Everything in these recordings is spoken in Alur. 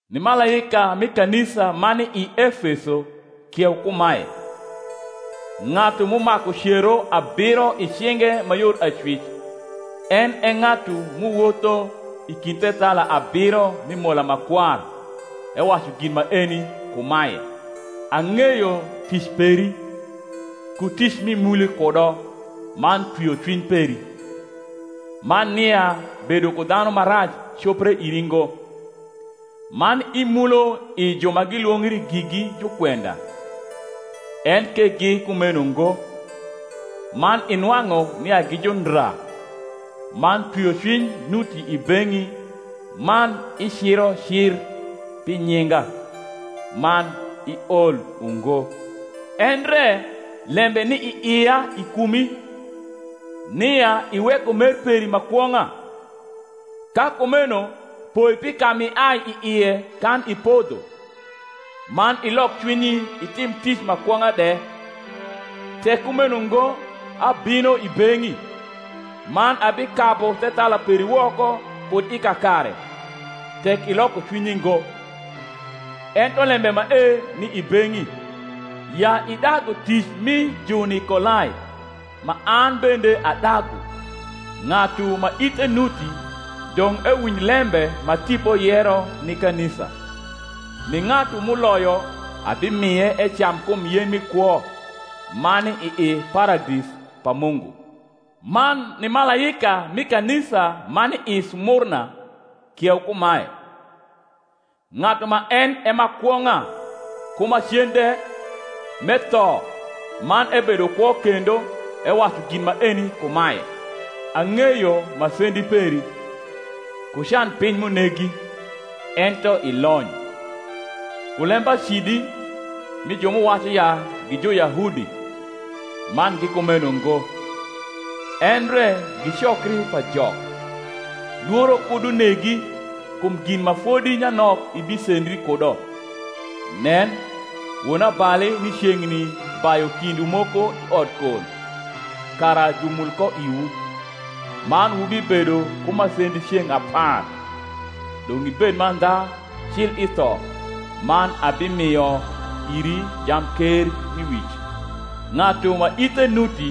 Ni malaika mi kanisa ma ni i Efeso kieu kumae: Ng’atu m’umaku cero abiro i cinge ma yor acwic, en e ng’atu m’uwotho i kind thethala abiro mi mola ma kwar ewacu gin maeni kumae: Ang’eyo tic peri, ku tic m’imuli kudo man twiocwiny peri, man nia bedo ku dhanu ma rac copre iri ngo, man imulo i ju ma gilwongri gigi jukwenda, enke gi kumeno ngo, man inwang’u nia gi jundra; man twiocwiny nuti i beng’i man iciro cir pi nyinga, man iol ungo. Endre lembe ni i ia i kumi, nia iweko mer peri ma kwong’a. Ka kumeno poi pi ka m’iai i ie kan ipodho, man ilok cwinyi itim tic ma kwong’a de; tek kumeno ngo abino i beng’i, man abikabu thethala peri woko kud i kakare, tek iloko cwinyi ngo. Ento lembe mae ni i beng’i, ya idagu tic mi Junikolai, ma an bende adagu. Ng’atu ma ithe nuti, dong’ ewinj lembe ma Tipo yero ni kanisa. Ni ng’atu m’uloyo, abimie ecam kum yen mi kwo, ma ni i Paradis pa Mungu. Man ni malaika mi kanisa ma ni i Smurna kieu kumae: Ng’atu ma en e ma kwong’a ku ma cen de, m’etho, man ebedo kwo kendo ewacu gin maeni kumae: Ang’eyo masendi peri, ku canpiny m’unegi (ento ilony), ku lembacidi mi ju m’uwacu ya gi Juyahudi, man gi kumeno ngo, endre gi cokri pa Jok. Lworo kud unegi kum gin ma fodi nyanok ibisendri kudo: nen, wonabali ni ceng’ni bayu kindwu moko i odkol, kara jumul ko iwu; man wubibedo ku masendi ceng’ apar. Dong’ ibed mandha cil i tho, man abimio iri jamkermiwic. Ng’atu ma ithe nuti,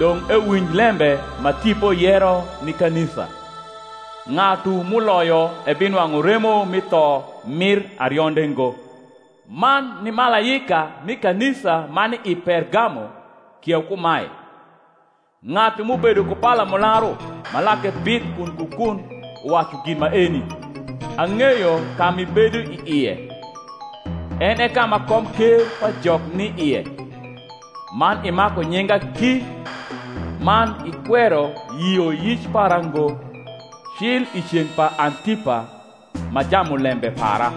dong’ ewinj lembe ma Tipo yero ni kanisa. Ng’atu m’uloyo ebinwang’u remo mi tho mir arionde ngo. Man ni malaika mi kanisa ma ni i Pergamo kieu kumae: Ng’atu m’ubedo ku palamularu ma lake bith kun ku kun uwacu gin maeni. Ang’eyo ka m’ibedo i ie, en e ka ma komker pa Jok ni ie; man imaku nyinga ki, man ikwero yioyic para ngo, cil i ceng’ pa Antipa ma jamulembe para,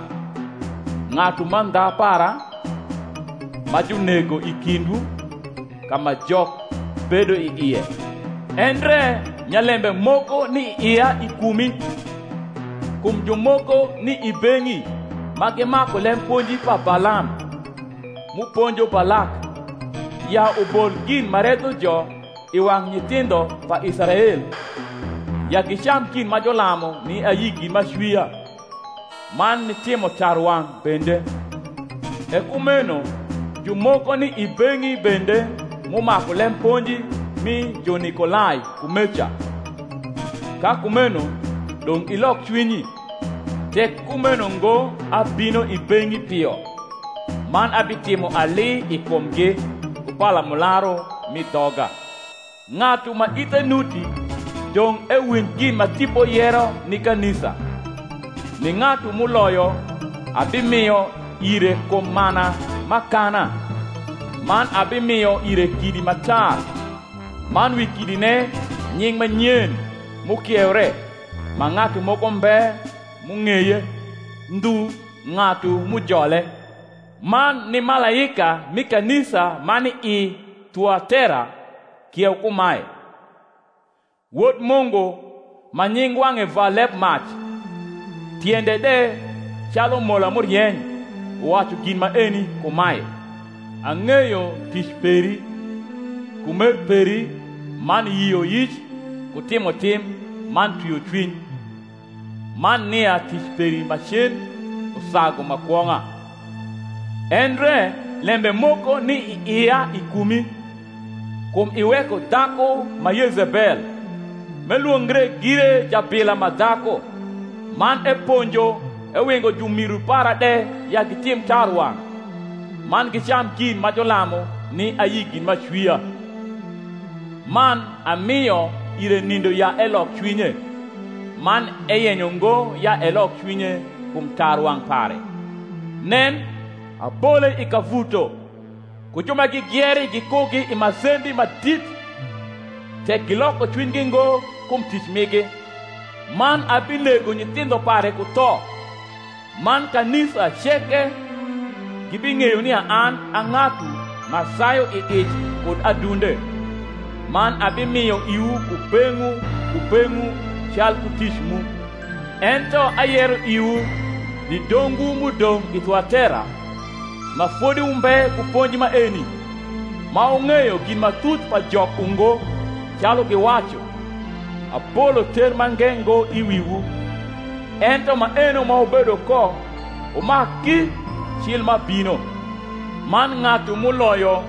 ng’atu mandha para, ma junego i kindwu, ka ma Jok bedo i ie. Endre nyalembe moko ni i ia i kumi, kum jumoko ni i beng’i ma gimaku lemponji pa Balam, m’uponjo Balak ya ubol gin ma redho jo i wang’ nyithindho pa Israel, ya gicam gin ma julamu ni ayi gin m’acwia, man nitimo tarwang’ bende. E kumeno jumoko ni i beng’i bende m’umaku lemponji mi Junikolai kumeca. Ka kumeno dong’ ilok cwinyi: tek kumeno ngo abino i beng’i pio, man abitimo ali i kumgi ku palamularu m’i dhoga. Ng’atu ma ithe nuti, dong’ ewinj gin ma Tipo yero ni kanisa. Ni ng’atu m’uloyo, abimio ire kum mana m’akana, man abimio ire kidi ma tar, man wi kidine nying’ ma nyen m’ukieure, ma ng’atu moko mbe m’ung’eye ndhu ng’atu m’ujole. Man ni malaika mi kanisa ma ni i Thuatera kieu kumae: Wod Mungu, ma nying wang’e va lebmac, tiende de calu mola m’urieny, uwacu gin maeni kumae: Ang’eyo tic peri, ku mer peri man yioyic ku timotim man twiocwiny, man nia tic peri ma cen usagu ma kwong’a. Endre lembe moko ni i ia i kumi, kum iweko dhaku ma Yezebel, m’elwongre gire jabila ma dhaku; man eponjo ewingo jumiru para de ya gitim tarwang’, man gicam gin ma julamu ni ayi gin m’acwia. Man amio ire nindo ya elok cwinye; man eyenyo ngo ya elok cwinye kum tarwang’ pare. Nen, abole i kavuto, ku ju ma gigieri gikugi i masendi ma dit, tek giloko cwinygi ngo kum tic migi. Man abinego nyithindho pare ku tho; man kanisa ceke gibing’eyo nia an a ng’atu ma sayu i ic kud adunde: man abimio iwu kubeng’wu kubeng’wu calku tic mu. Ento ayero iwu, ni dongwu m’udong’ i Thuatera, ma fodi wumbe ku ponji maeni, ma wung’eyo gin ma thuth pa Jok ungo, calu giwacu; abolo ter mange ngo i wiwu. Ento maeno ma wubedo ko, wumak ki cil m’abino. Man ng’atu m’uloyo,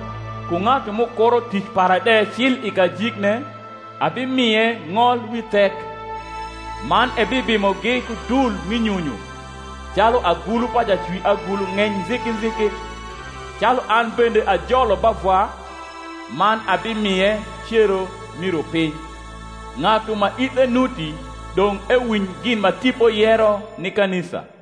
ku ng’atu m’ukuro tic para de cil i kajikne, abimie ng’ol wi thek: man ebibimogi ku dul mi nyunyu, calu agulu pa jacwiagulu ng’eny nziki nziki; calu an bende ajolo ba Vwa; man abimie cero mi rupiny. Ng’atu ma ithe nuti, dong’ ewinj gin ma Tipo yero ni kanisa.